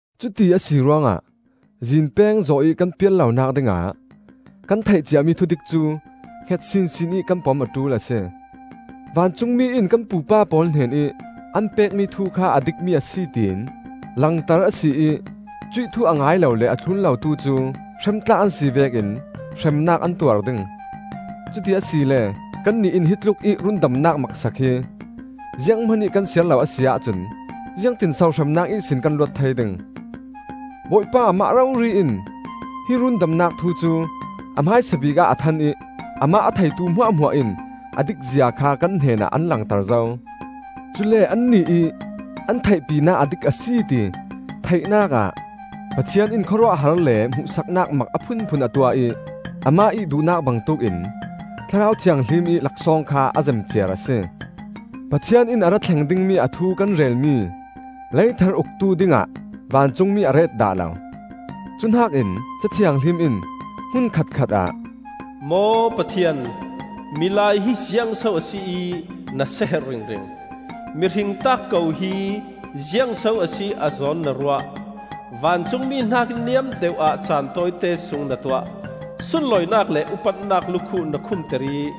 Cuti a si ruangah zinpeng zawh ih kan pial lonak dingah kan theih ciami thudik cu hnget sinsin ih kan pom a ṭul a si. Vancungmi in kan pupa pawl hnenih an pekmi thu kha a dikmi a si tiin langter a si ih cuih thu a ngai lo le a thlun lotu cu hrem tlak an si vekin hremnak an tuar ding. Cuti asile kannih in hi tlukih rundamnak maksak hi zianghman ih kan siar lo a si ahcun ziangtinso hremnak ihsin kan luat thei ding? Bawipa amah rori in hi rundamnak thu cu a hmaisabik ah a than ih amah a theitu hmuahhmuah in a dik zia kha kan hnenah an langter zo. Cule annih ih an theihpinak a dik a si ti theihnak ah Pathian in khawruahhar le hmuhsaknak mak a phunphun a tuah ih Amah ih duhnak bangtuk in Thlarau Thianghlim ih laksawng kha a zem ciar a si. Pathian in a ra thleng dingmi a thu kan relmi lei thar uktu dingah vancungmi a ret dah lo. Cu hnakin, Ca Thianghlim in hmun khat khatah, “Maw Pathian, milai hi ziangso a si ih na seherh ringring? Mihring taak ko hi ziangso a si ih a zawn na ruah? Vancungmi hnakih niam deuh ah caan tawite sung na tuah; Sunlawinak le upatnak lukhuh na khumter ih,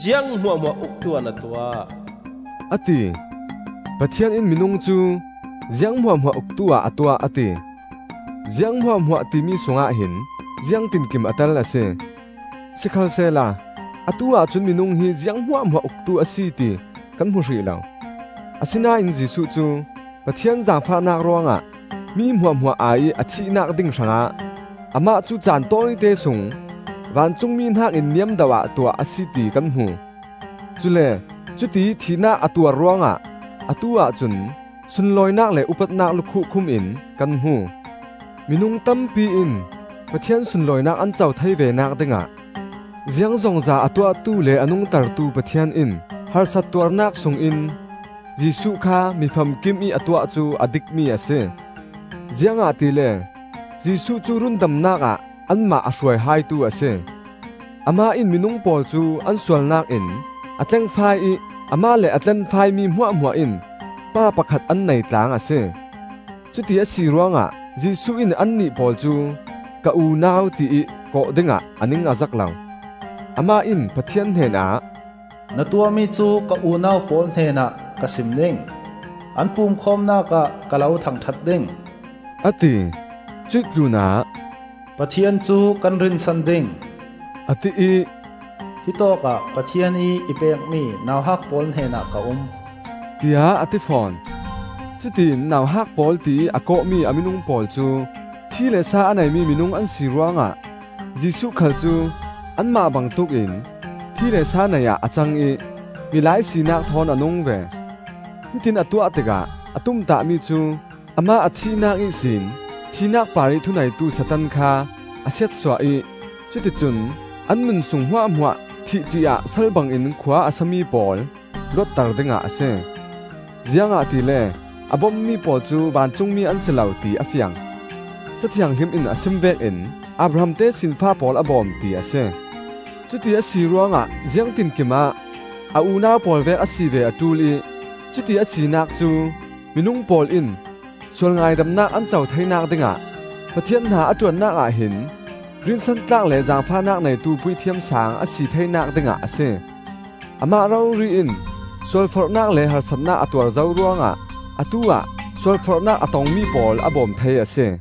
Ziang hmuahhmuah uktu-ah na tuah,” a ti. Pathian in minung cu, “Ziang hmuahhmuah uktu-ah a tuah,” a ti. Ziang hmuahhmuah timi sungah hin ziang tinkim a tel a si. Sikhalsehla atu-ah cun minung hi ziang hmuahhmuah uktu a si ti kan hmu hrih lo. Asinain Jesuh cu, Pathian zaangfahnak ruangah mi hmuahhmuah ai-ih a thihnak ding hrangah, amah cu caan tawite sung vancungmi hnakin niam deuhah tuah a si ti kan hmu. Cule cutiih thihnak a tuar ruangah atu-ah cun sunlawinak le upatnak lukhuh khumin kan hmu. Minung tampi in Pathian sunlawinak an co thei venak dingah ziangzongza a tuahtu le a nungtertu Pathian in harsat tuarnak sungin Jesuh kha mi famkimih a tuah cu a dikmi a si. Ziangahtile Jesuh cu rundamnak ah anmah a hruai haitu a si. Amah in minung pawl cu an sualnak in a tlengfai ih Amah le a tlenfaimi hmuahhmuah in Pa pakhat an nei tlaang a si. Cuti a si ruangah Jesuh in annih pawl cu ‘Ka unau,’ tiih kawh dingah a ning a zak lo. Amah in Pathian hnenah, “Na tuahmi cu ka unau pawl hnenah ka sim ding; An pumkhawmnak ah ka lo thangṭhat ding,” a ti. Cuih tlunah, “Pathian cu kan rinsan ding,” a ti ih, “hittawk ah Pathian ih i pekmi nauhak pawl hnenah ka um,” tiah a ti fawn. Cutiin “Nauhak pawl,” tiih a kawhmi a minung pawl cu thi le sa a neimi minung an si ruangah Jesuh khal cu anmah bangtuk in thi le sa nei-ah a cang ih milai sinak thawn a nung ve. Hitiin a tuah tikah a tumtahmi cu amah a thihnak ihsin thihnak parih thu neitu Satan kha a siatsuah ih, cuticun an nun sung hmuahhmuah thih ṭih-ah sal bangin khua a sami pawl luatter dingah a si. Ziangahtile a bommi pawl cu vancungmi an si lo, ti a fiang. Ca Thianghlim in a sim vekin, “Abraham tesinfa pawl a bawm,” ti a si. Cuti a si ruangah ziangtinkim ah a unau pawl vek a si ve a ṭul ih cuti a sinak cu minung pawl in sual ngaidamnak an co theinak dingah Pathian hna a ṭuannak ah hin rinsantlak le zaangfahnak neitu Puithiam Saang a si theinak dingah a si. Amah rori in sualforhnak le harsatnak a tuar zo ruangah atu-ah sualforhnak a tongmi pawl a bawm thei a si.